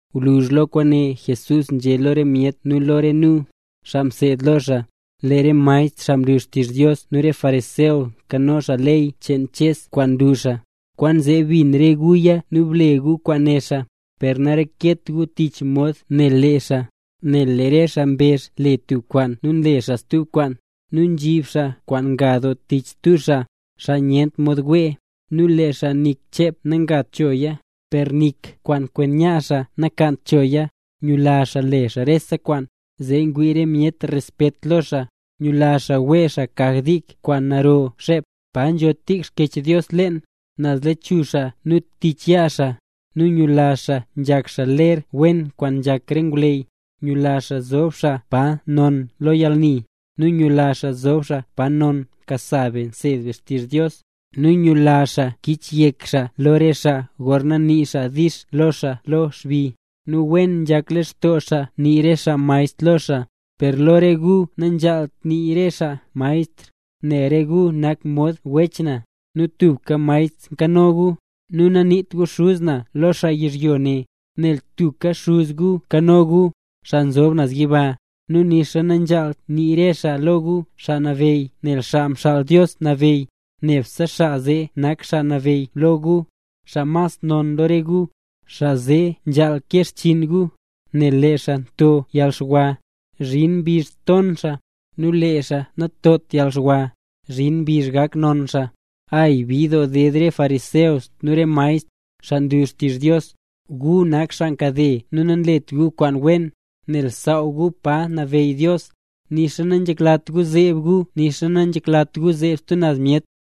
Gwluzh lo kwaane Jesús nzhé lo re myet nu lo re nu, xaa mseed lo xaa: —Lee re maestr xaa nlu xtizh Dios nu re fariseo nkano xaa ley cheen Ches kwaan nlu xaa. Kwaanzee bin re guya nu ble gu kwaan né xaa. Per nareket gu tich mod nle xaa, nel lee re xaa mbezh le tub kwaan nu nle xaa stub kwaan. Nu nzhib xaa kwaan nga doo tich stub xaa, xaa nyent mod wee. Nu lee xaa nik chep nakagt choya, per nik kwaan kwen yaa xaa nakaant choya. Nyula xaa le xaa rese kwaan, zee ngwii re myet respet lo xaa. Nyula xaa wee xaa kaj dik kwaan narora xep, pa nzho tik Xkyech Dios leen, naz lechuzh xaa nu tich yaa xaa. Nu nyula xaa nzhak xaa ler wen kwaan nzhak re ngwleyy. Nyula xaa zob xaa pa non lo yalni, nu nyula xaa zob pa non pa nkasa be nseed be xtizh Dios. Nu nyula xaa kichyek re xaa lo xaa gorna nii xaa “dix” lo xaa lo xbi, nu wen nzhak lextoo xaa nii re xaa “maestr” lo xaa. ’Per lo re gu nanzhaalt nii re xaa “maestr”, nel re gu nak mod wech na, nu tubka Maestr nkano gu. Nu naniit gu “xuz na” lo tub xaa yizhyo ne, nel tubka Xuz gu nkano gu, xaa nzob naz yiba. Nu nixa nanzhaalt nii re xaa lo gu “xaa nabeyy” nel Xaa Mxaal Dios Nabeyy, nebse xaa zee nak Xaa Nabeyy lo gu. Xaa mas non lo re gu, xaa zee nzhaal kee xchiin gu. Nel lee xaa nto yalxwa, zhin mbizh ton xaa; nu lee xaa nantot yalxwa, zhin mbizh gak non xaa. ’¡Ay, bid doo ded re gu fariseo nu re gu maestr, xaa nlu xtizh Dios! ¡Gu nak xaa nkade nu nanlet gu kwaan wen! Nel nsaaw gu pa nabeyy Dios, nixa nanzheklat gu zeeb gu nu nixa nanlat gu zeeb stub naz myet.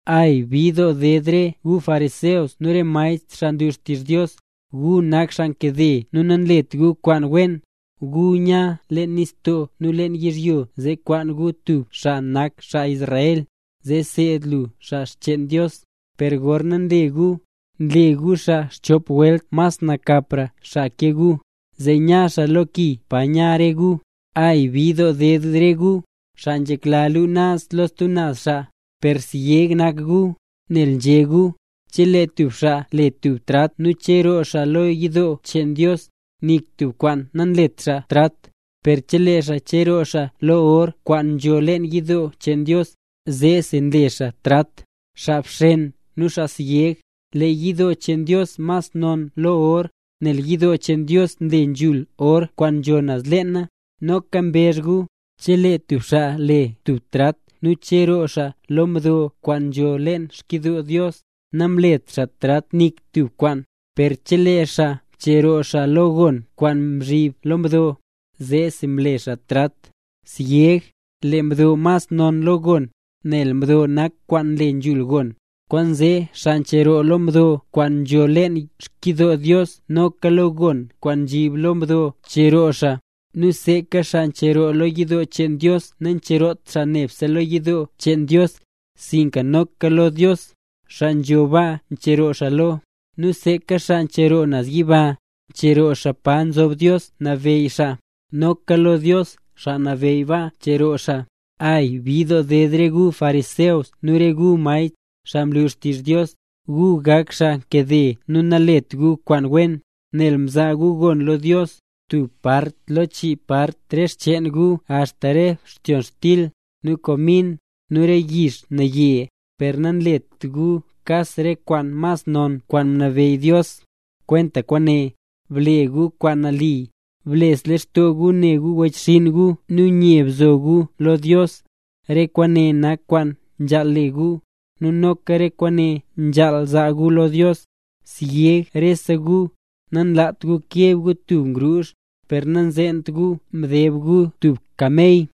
’¡Ay, bid doo ded re gu fariseo nu re gu maestr, xaa nlu xtizh Dios! ¡Gu nak xaa nkade nu nanlet gu kwaan wen! Gu nya nze leen nistoo nu lo yizhyo zee kwaan gu tub xaa nanakt xaa Israel, zee nseed lu xaa xcheen Dios, per gorna nle guya, nle gu xaa xchop welt mas nakapra xaa ke gu, zee nya xaa lo ki pa nya re gu. ’¡Ay, bid doo ded re gu, xaa nzhekla luu naz lo stub xaa, per syeg nak gu! Nel nzhé gu: “Chelee tub xaa le tub trat nu cheroo xaa lo yidoo cheen Dios, nik tub kwaan namlet xaa trat. Per chelee xaa cheroo xaa lo or kwaan nzho leen yidoo cheen Dios, zeesi mle xaa trat.” ¡Xaa bxen nu xaa syeg! Lee yidoo cheen Dios mas non lo or, nel yidoo cheen Dios mle nzhul or kwaan nzho naz leena. Noka mbezh gu: “Chelee tub xaa le tub trat nu cheroo xaa lo mdo kwaan nzo leen xkyidoo Dios, namlet xaa trat nik tub kwaan. Per chelee xaa cheroo xaa lo gon kwaan nzhib lo mdo, zeesi mle xaa trat.” ¡Syeg! Lee mdo mas non lo gon, nel mdo nak kwaan nle nzhul gon. Kwaanzee xaa ncheroo lo mdo kwaan nzho leen xkyidoo Dios noka lo gon kwaan nzhib lo mdo ncheroo xaa. Nu seeka xaa ncheroo lo yidoo cheen Dios, nancheroot xaa nebse lo yidoo cheen Dios, sinka noka lo Dios, xaa nzho baa, ncheroo xaa lo. Nu seeka xaa ncheroo naz yiba, ncheroo xaa pa nzob Dios nabeyy xaa, noka lo Dios xaa nabeyy baa, ncheroo xaa. ’¡Ay, bid doo ded re gu fariseo nu re gu maestr, xaa nlu xtizh Dios! ¡Gu nak xaa nkade nu nanlet gu kwaan wen! Nel nzaa gu gon lo Dios, tub part lo chii part re xcheen gu axta re btyonxtil, nu komin, nu re yix naye. Per nanlet gu kas re kwaan mas non kwaan mnabeyy Dios, kwenta kwaane: Ble gu kwaan nali, bles lextoo gu ne gu wechxinn gu nu nye bzo gu lo Dios. Re kwaane nak kwaan nzhaal le gu, nu noka re kwaan nzhaal zaa gu lo Dios. Syeg rese gu, nanlaat gu keb gu tub ngruuzh, per nanzeent gu mdeb gu tub kamey.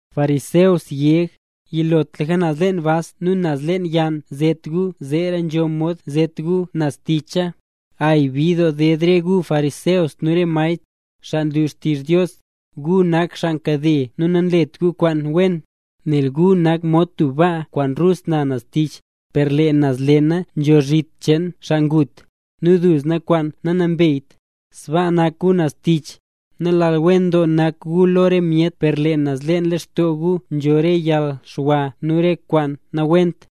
¡Fariseo syeg! Yilotlaka naz leen bas nu naz leen yann zet gu, zeera nzho mod zet gu naz ticha. ’¡Ay, bid doo ded re gu fariseo nu re gu maestr, xaa nlu xtizh Dios! ¡Gu nak xaa nkade nu nanlet gu kwaan wen! Nel gu nak mod tub baa kwaan rus na naz ticha, per lee naz leena nzho zhit cheen xaa ngut, nu duzna kwaan nanambeyt. Sbaa nak gu naz tich, nalal wen doo nak gu lo re myet per lee naz leen lextoo gu nzho re yalxwa nu re kwaan nawent.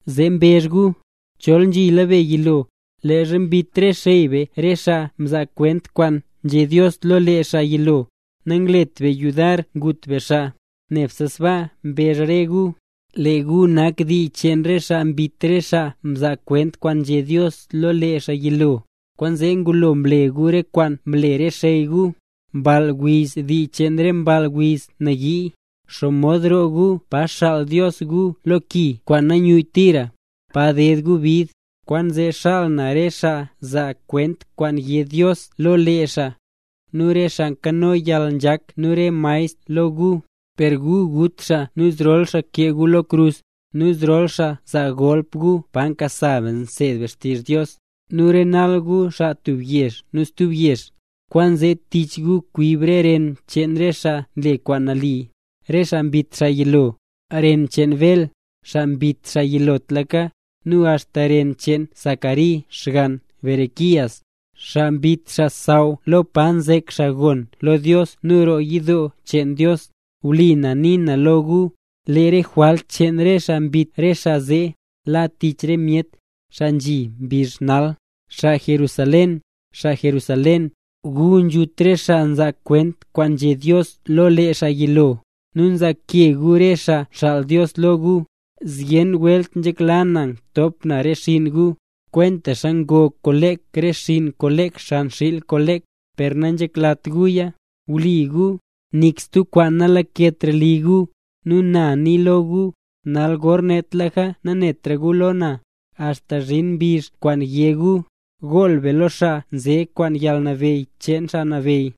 Zee mbezh gu: “Chol nzhila be yilo, leezha mbit re xey be re xaa mzaa kwent kwaan nzhé Dios lo lee xaa yilo, nanglet be yudar ngut be xaa”. Nebse sbaa mbezh re gu, lee gu nak dii cheen re xaa mbit re xaa mzaa kwent kwaan nzhé Dios lo lee xaa yilo. Kwaanzee gulo ble gu re kwaan mle re xey gu. ’¡Mball wiz, dii cheen re mball wiz nayii! ¿Xomod roo gu pa xaal Dios gu lo ki kwaan nayuyyt tira, pa ded gu bid? Kwaanzee xaal na re xaa zaa kwent kwaan yé Dios lo lee xaa, nu re xaa nkano yalnzhak nu re maestr lo gu. Per gu gut xaa nu zrol xaa kee gu lo krus, nu zrol xaa zaa golp gu pa nkasa be nseed be xtizh Dios, nu renal gu xaa tub yezh nu stub yezh. Kwaanzee tich gu kwib re ren cheen re xaa mle kwaan nali, re xaa mbit xaa yilo. Ren cheen Bel, xaa mbit xaa yilotlaka, nu axta ren cheen Zacari xgann Berequías, xaa mbit xaa xsaww lo pa nzek xaa gon lo Dios nu roo yidoo cheen Dios. Wlipa na nii na lo gu, lee re jwalt cheen re xaa mbit re xaa zee, la tich re myet, xaa nzhi mbizh nal. ’Xaa Jerusalén, xaa Jerusalén, gu nzhut re xaa nzaa kwent kwaan nzhé Dios lo lee xaa yilo, nu nzaake gu re xaa nxaal Dios lo gu. Zyen welt nzhekla na ngtop na re xinn gu, kwentaxa ngo kolek re xinn kolek xan xiil kolek, per nanzheklat guya. Wii gu, nik stub kwaan nalaketra li gu. Nu na nii lo gu, nal gornetlaka nanetra gu lo na, axta zhin mbizh kwaan yé gu: “¡Gool be lo xaa nze kwaan yalnabeyy cheen Xaa Nabeyy!”